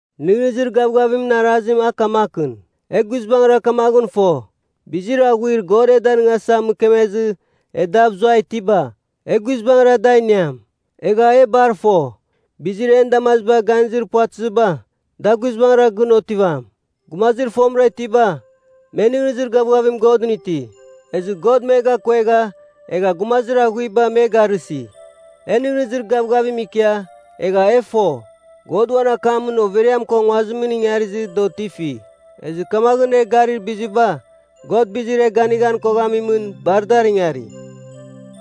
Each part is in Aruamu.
Nɨghnɨzir gavgavimɨn arazim a kamakɨn. E guizbangɨra kamaghɨn fo, bizir aghuir God e danɨngasa mɨkemezɨ e dav zuai itiba, e guizbangɨra da iniam. Egha e bar fo, bizir en damaziba ganizir puvatɨziba, da guizbangɨra gɨn otivam. Gumazir fomɨra itiba, me nɨghnɨzir gavgavim Godɨn iti, ezɨ God me gakuegha, egha gumazir aghuiba me garɨsi. E nɨghnɨzir gavgavim ikia, egha e fo, God uan akamɨn overiam ko nguazim ingarizɨ da otifi. Ezɨ kamaghɨn, e garir biziba, God bizir e ganighan koghamimɨn, bar dar ingari.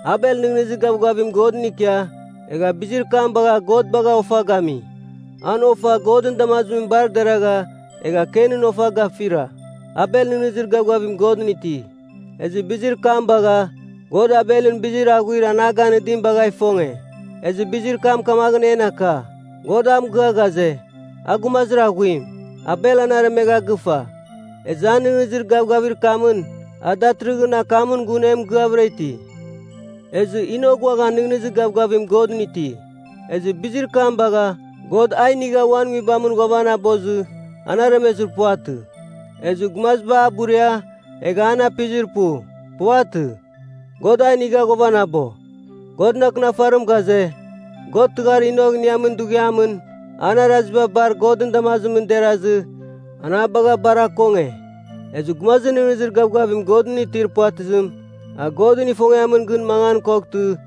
Abel nɨghnɨzir gavgavim Godɨn ikia, egha bizir kam bagha God bagha ofa gami. An ofa Godɨn damazim bar deragha, egha Kenɨn ofa gafira. Abel nɨghnɨzir gavgavim Godɨn iti, ezɨ bizir kam bagha God Abelɨn bizir aghuir an a ganɨdim bagha ifonge. Ezɨ bizir kam kamaghɨn en aka, God a mɨgɨa ghaze, a gumazir aghuim. Abel an aremegha gɨfa. Ezɨ an nɨghnɨzir gavgavir kamɨn a datɨrɨghɨn akamɨn gun e mɨgɨavɨra iti. Ezɨ Enok uaghan nɨghnɨzir gavgavim Godɨn iti. Ezɨ bizir kam bagha God a inigha uan Nguibamɨn ghuavanabozɨ an aremezir puvatɨ. Ezɨ gumaziba a buria, egha me an apizir pu. Puvatɨ, God a inigha ghuavanabo. Godɨn Akɨnafarim ghaze, God tɨghar Enok iniamɨn dughiamɨn, an araziba bar Godɨn damazimɨn derazɨ an a bagha bar akonge. Ezɨ gumazir nɨghnɨzir gavgavim Godɨn itir puvatɨzim, a Godɨn ifongiamɨn gɨn mangan koghtɨ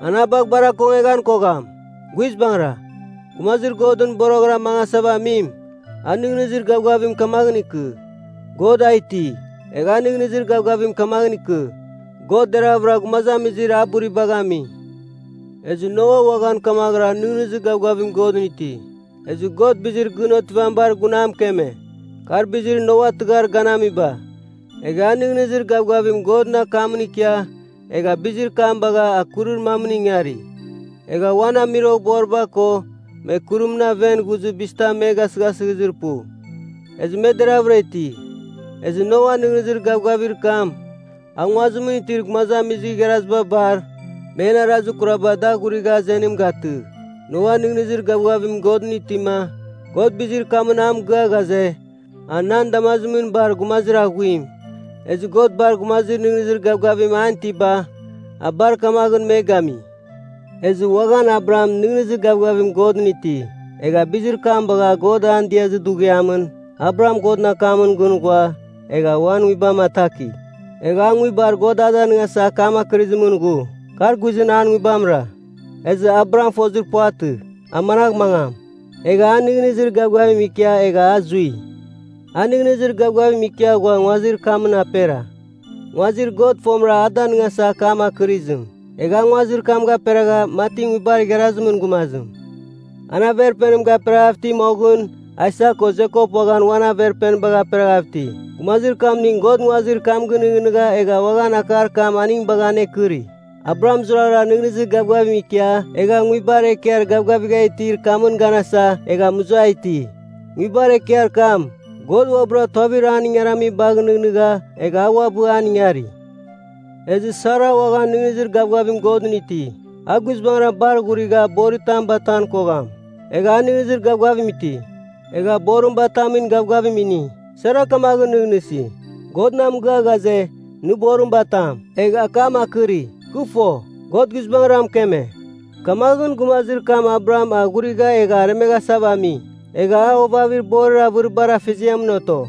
an a bagh bar akongeghan kogham. Guizbangɨra, gumazir Godɨn boroghɨra mangasava amim, a nɨghnɨzir gavgavim kamaghɨn ikɨ, God a iti. Egh a nɨghnɨzir gavgavim kamaghɨn ikɨ, God deravɨra gumazamizir a buribagh ami. Ezɨ Noa uaghan kamaghɨra nɨghnɨzir gavgavim Godɨn iti. Ezɨ God bizir gɨn otivamibar gun a mɨkeme. Kar bizir Noa tɨghar ganamiba. Egha a nɨghnɨzir gavgavim Godɨn akamɨn ikia, egha bizir kam bagha a kurir mamɨn ingari. Egha uan amuiroghboriba ko, me kurimɨn aven ghuzɨ bizitam me gasɨghasɨzir pu, ezɨ me deravɨra iti. Ezɨ Noan nɨghnɨzir gavgavir kam, a nguazimɨn itir gumazamizir igharaziba bar, men arazir kuraba da aghurigha azenim gatɨ. Noa nɨghnɨzir gavgavim Godɨn itima, God bizir kamɨn a mɨgɨa ghaze, a nan damazimɨn bar gumazir aghuim. Ezɨ God bar gumazir nɨghnɨzir gavgavim an itiba, a bar kamaghɨn me gami. Ezɨ uaghan Abraham nɨghnɨzir gavgavim Godɨn iti. Egha bizir kam bagha God an diazir dughiamɨn, Abraham Godɨn akamɨn gɨn ghua, egha uan nguibam ataki. Egha a nguibar God a danɨngasa akam akɨrɨzimɨn ghu, kar guizɨn an nguibamra. Ezɨ Abraham fozir puvatɨ, a managh mangam. Egha a nɨghnɨzir gavgavim ikia egha a zui. A nɨghnɨzir gavgavim ikia ghua nguazir kamɨn apera, nguazir God fomɨra a danɨngasa akam akɨrizim. Egha a nguazir kam gaperagha mati nguibar igharazimɨn gumazim. An Averpenim gaperaghav iti, moghɨn Aisak ko Jekop uaghan uan averpenibagh aperaghav iti, gumazir kamning God nguazir kam gɨnɨghnɨgha egha uaghan akar kam aning bagha anekɨri. Abraham zurara nɨghnɨzir gavgavim ikia egha nguibar ekiar gavgavigha itir kamɨn ganasa egha muza iti. Nguibar ekiar kam, God uabɨra tuavir an ingaramibagh nɨghnɨgha egha a uabɨ an ingari. Ezɨ Sara uaghan nɨghnɨzir gavgavim Godɨn iti. A guizbangɨn bar ghurigha boritam batan kogham. Egha a nɨghnɨzir gavgavim iti. Egha borim batamin gavgavim ini. Sara kamaghɨn nɨghnɨsi, “God na mɨgɨa ghaze, ‘Nɨ boritam batam,’ egh akam akɨri. Kɨ fo, God guizbangɨra mɨkeme.” Kamaghɨn, gumazir kam Abraham a ghurigha egha aremeghasava ami, egha a ovavir borir avɨribar afeziamɨn oto.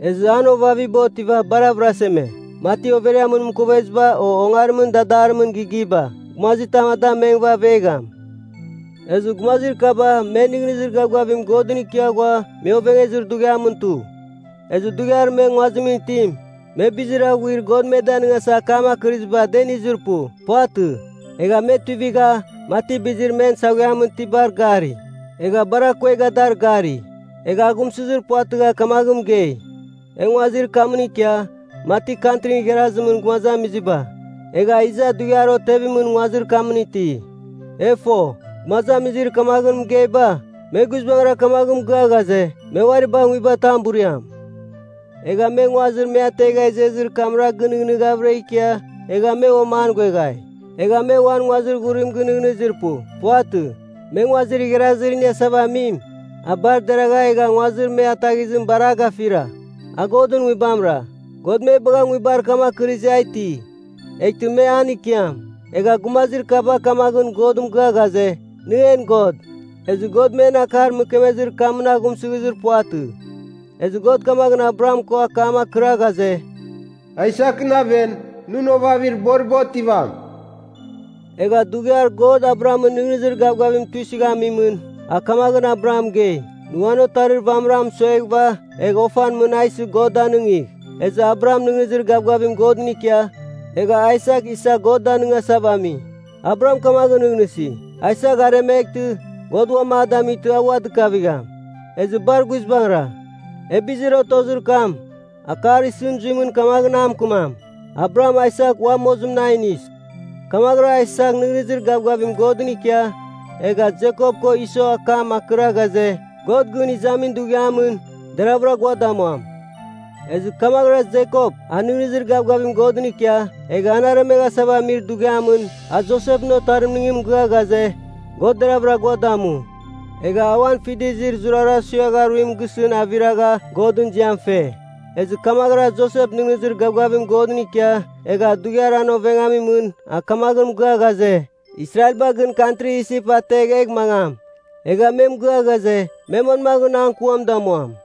Ezɨ an ovaviba otiva bar avɨraseme, mati overiamɨn mɨkoveziba, o ongarimɨn dadarimɨn gigiba. Gumazitam da mengɨva avegham. Ezɨ gumazir kaba me nɨghnɨzir gavgavim Godɨn ikia ghua me ovengezir dughiamɨn tu. Ezɨ dughiar me nguazimɨn itim, me bizir aghuir God me danɨngasa akam akɨrɨziba, da inizir pu. Puvatɨ. Egha me tuivigha, mati bizir men saghuiamɨn itibar gari, egha bar akuegha dar gari. Egha aghumsɨzir puvatɨgha kamaghɨn mɨgei, “E nguazir kamɨn ikia, mati kantrin igharazimɨn gumazamiziba, egha iza dughiar otevimɨn nguazir kamɨn iti.” E fo, gumazamizir kamaghɨn mɨgeiba, me guizbangɨra kamaghɨn mɨgɨa ghaze, me uari bagh nguibatam buriam. Egha me nguazir me ategha izezir kamra gɨnɨghnɨghavɨra ikia, egha me uam an ghueghai. Egha me uan nguazir ghurim gɨnɨghnɨzir pu. Puvatɨ. Me nguazir igharazir iniasava amim, a bar deragha egha nguazir me ataghizim bar a gafira. A Godɨn Nguibamɨra. God me bagha nguibar kam akɨrizɨ a iti, eghtɨ me an ikiam. Egha gumazir kaba kamaghɨn God mɨgɨa ghaze, “Nɨ en God.” Ezɨ, God men akar mɨkemezir kamɨn aghumsɨghizir puvatɨ. Ezɨ God kamaghɨn Abraham ko akam akɨra ghaze, “Aisakɨn aven, nɨn ovavir boriba otivam.” Egha dughiar God Abrahamɨn nɨghnɨzir gavgavim tuisɨghamimɨn, a kamaghɨn Abraham mɨgei, “Nɨ uan otarir vamɨra mɨsueghɨva egh ofan mɨn a isɨ God danɨngigh.” Ezɨ Abraham nɨghnɨzir gavgavim Godɨn ikia, egha Aisak isa God danɨngasava ami. Abraham kamaghɨn nɨghnɨsi, “Aisak aremeghtɨ, God uan a damightɨ a ua dɨkavigham.” Ezɨ bar guizbangɨra, e bizir otozir kam, akar isɨn zuimɨn kamaghɨn a mɨkɨmam, Abraham Aisak ua mozimɨn a inis. Kamaghɨra Aisak nɨghnɨzir gavgavim Godɨn ikia egha Jekop ko Iso akam akɨra ghaze, God gɨn izamin dughiamɨn, deravɨra gua damuam. Ezɨ kamaghɨra Jekop a nɨghnɨzir gavgavim Godɨn ikia, egha an aremeghasava amir dughiamɨn, a Josepɨn otarimning mɨgɨa ghaze, God deravɨra gua damu. Egha a uan fidizir zurara suiagha aruim gisɨn aviragha Godɨn ziam fe. Ezɨ kamaghɨra Josep nɨghnɨzir gavgavim God ikia, egha dughiar an ovengamimɨn a kamaghɨn mɨgɨa ghaze, Israelba gɨn kantri Isip ategh egh mangam. Egha me mɨgɨa ghaze, me manmaghɨn an kuam damuam.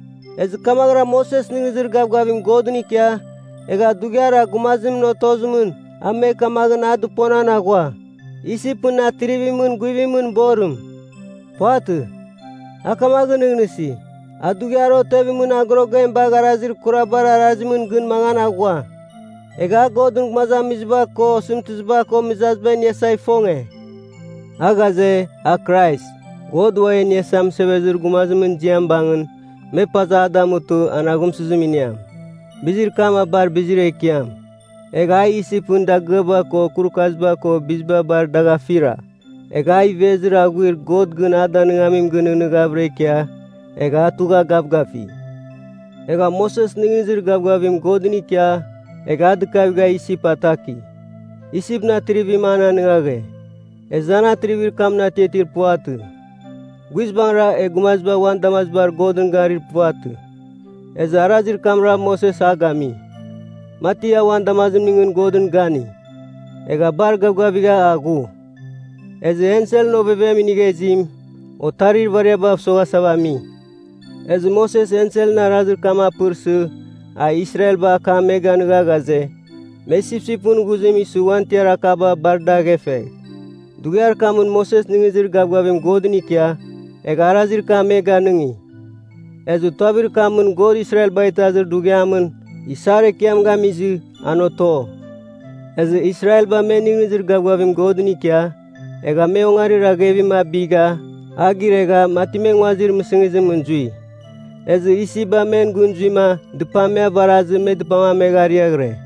Ezɨ kamaghɨra Moses nɨghnɨzir gavgavim Godɨn ikia, egha dughiar a gumazimɨn otozimɨn, a me kamaghɨn a dɨponan aghua, Isipɨn Atrivimɨn guivimɨn borim. Puvatɨ. A kamaghɨn nɨghnɨsi, a dughiar otevimɨn agorogem bagh arazir kurabar arazimɨn gɨn mangan aghua. Egha a Godɨn gumazamiziba ko, osɨmtɨziba ko mɨzaziba iniasa ifonge. A ghaze, a Krais, God Ua E Iniasa Mɨsevezir Gumazimɨn ziam bangɨn, me paza a damutɨ an aghumsɨzim iniam. Bizir kam a bar bizir ekiam, egha a Isipɨn dagɨaba ko kurukaziba ko biziba bar dagh afira. Egha a ivezir aghuir God gɨn a danɨngamim gɨnɨghnɨghavɨra ikia, egha a tugha gavgafi. Egha Moses nɨghnɨzir gavgavim Godɨn ikia egha a dɨkavigha Isip ataki. Isipɨn atrivim an anɨngaghe, ezɨ an atrivir kamɨn atiatir puvatɨ. Guizbangɨra, e gumaziba uan damazibar Godɨn garir puvatɨ. Ezɨ arazir kamra Moses a gami, mati a uan damazimningɨn Godɨn gani, egha bar gavgavigha a ghu. Ezɨ Enselɨn Ovevem Inigha Izim, otarir ivariabav soghasava ami, ezɨ Moses Enselɨn arazir kam apɨrsɨ, a Israelba akam me ganɨga ghaze, me sipsipɨn ghuzim isɨ uan tiar akaba bar dar aghefegh. Dughiar kamɨn Moses nɨghnɨzir gavgavim Godɨn ikia, egha arazir kam me ganɨngi, ezɨ tuavir kamɨn God Israelbagh Itazir Dughiamɨn Isar Ekiam gamizɨ, an oto. Ezɨ Israelba me nɨghnɨzir gavgavim Godɨn ikia, egha me Ongarir Aghevim abigha a giregha mati me nguazir mɨsɨngizimɨn zui. Ezɨ Isipba men gɨn zuima dɨpam me avarazɨ me dɨpam amegha ariaghɨre.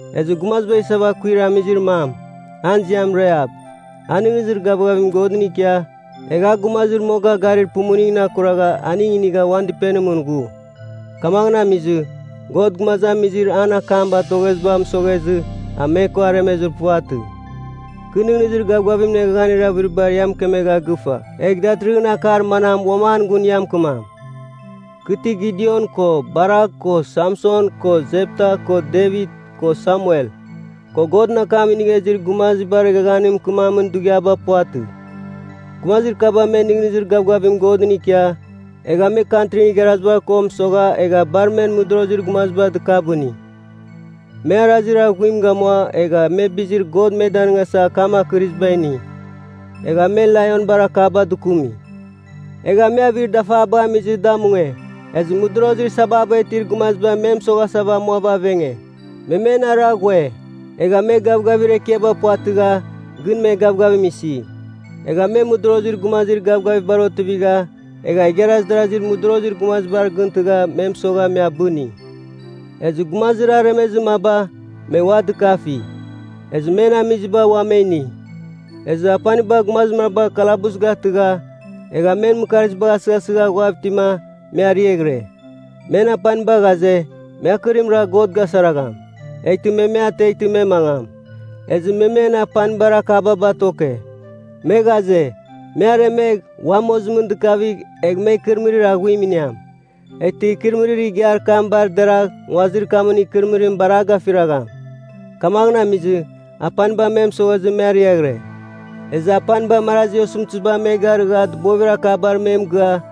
Ezɨ gumaziba isava akuir amizir mam, an ziam Rahap, a nɨghnɨzir gavgavim Godɨn ikia, egha a gumazir moga garir pumuningɨn akuragha aning inigha uan dɨpenimɨn ghu. Kamaghɨn amizɨ, God gumazamizir an akam batogheziba mɨsoghezɨ, a me ko aremezir puvatɨ. Kɨ nɨghnɨzir gavgavimɨn eghaghanir avɨriba ia mɨkemegha gɨfa, egh datɨrɨghɨn akar manam uam an gun ia mɨkɨmam? Kɨ ti Gidion ko Barak ko Samson ko Jepta ko Devit ko Samuel, ko Godɨn akam nɨgha izir gumazibar eghaghanimɨn mɨkɨmamin dughiaba puvatɨ. Gumazir kaba me nɨghnɨzir gavgavim Godɨn ikia, egha me kantrin igharaziba ko mɨsogha egha bar men mɨdorozir gumaziba dɨkabɨni. Me arazir aghuim gamua, egha me bizir God me danɨngasa akam akɨriziba ini. Egha me Laionbar akaba dɨkumi. Egha me avir dafabagh amizɨ da mungue. Ezɨ mɨdorozir sababa itir gumaziba me me mɨsoghasa amuava avenge, me men ara ghue. Egha me gavgavir ekiaba puvatɨgha, gɨn me gavgavim isi. Egha me mɨdorozir gumazir gavgavibar otivigha, egha igharaz darazir modorozir gumaziba gɨntɨgha me mɨsogha me abɨni. Ezɨ gumazir aremezir maba, me ua dɨkafi, ezɨ men amiziba ua me ini. Ezɨ apaniba gumazir maba kalabus gatɨgha, egha men mɨkarzibagh asɨghasɨgha ghuav itima, me ariaghɨre. Men apaniba ghaze, me akɨrim ragh God gasaragham, eghtɨma me me ateghtɨ me mangam. Ezɨ me men apanibar akaba batoke. Me ghaze, me aremegh, ua mozimɨn dɨkavigh egh me ikɨrɨmɨrir aghuim iniam. Eghtɨ ikɨrɨmɨrir igiar kam bar deragh nguazir kamɨn ikɨrɨmɨrim bar a gafiragham. Kamaghɨn amizɨ, apaniba me mɨsoghezɨ, me ariaghɨre. Ezɨ apaniba marazi osɨmtɨziba me garɨgha dɨbovir akabar me mɨgɨa,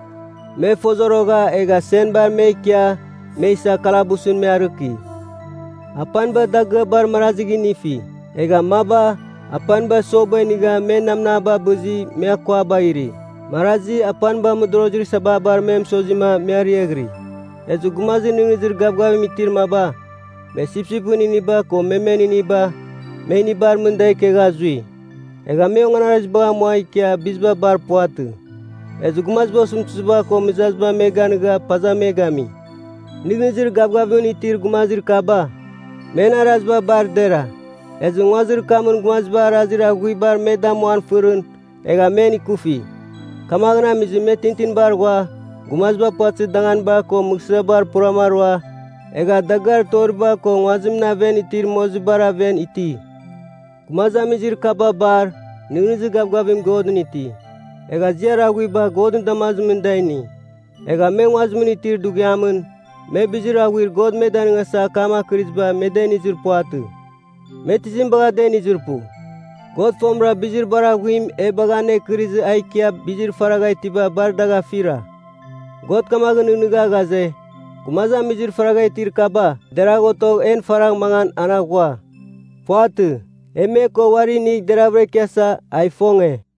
me fozorogha egha senbar me ikia, me isa kalabusɨn me arɨki. Apaniba dagɨabar marazigh inifi. Egha maba, apaniba soba inigha egha men namnaba abɨzɨ me akuabagh iri. Marazi, apaniba mɨdorozir sababar me mɨsozima me ariaghiri. Ezɨ gumazir nɨghnɨzir gavgavim itir maba, me sipsipɨn iniba ko memen iniba, me inibar mɨn da ikegha zui. Egha me onganarazibagh amua ikia biziba bar puvatɨ. Ezɨ gumaziba osɨmtɨziba ko mɨzaziba me ganɨga paza me gami. Nɨghnɨzir gavgavimɨn itir gumazir kaba, men araziba bar dera, ezɨ nguazir kamɨn gumaziba arazir aghuibar me damuan fɨrɨn, egha men ikufi. Kamaghɨn amizɨ me tintinbar ghua, gumaziba puvatɨzir danganibar ko mɨghsɨaba puram arua, egha dagɨar toriba ko nguazimɨn aven itir mozibar aven iti. Gumazamizir kaba bar, nɨghnɨzir gavgavim Godɨn iti, egha ziar aghuiba Godɨn damazimɨn da ini. Egha me nguazimɨn itir dughiamɨn, me bizir aghuir God me danɨngasa akam akɨriziba me da inizir puvatɨ. Me tizim bagha da inizir pu? God fomɨra bizir bar aghuim e bagha anekɨrizɨ a ikia bizir faragha itiba bar dagh afira. God kamaghɨn nɨghnɨgha ghaze, gumazamizir faragha itir kaba deragh otogh en faragh mangan, an aghua. Puvatɨ. E me ko uari inigh deravɨra ikiasa, a ifonge.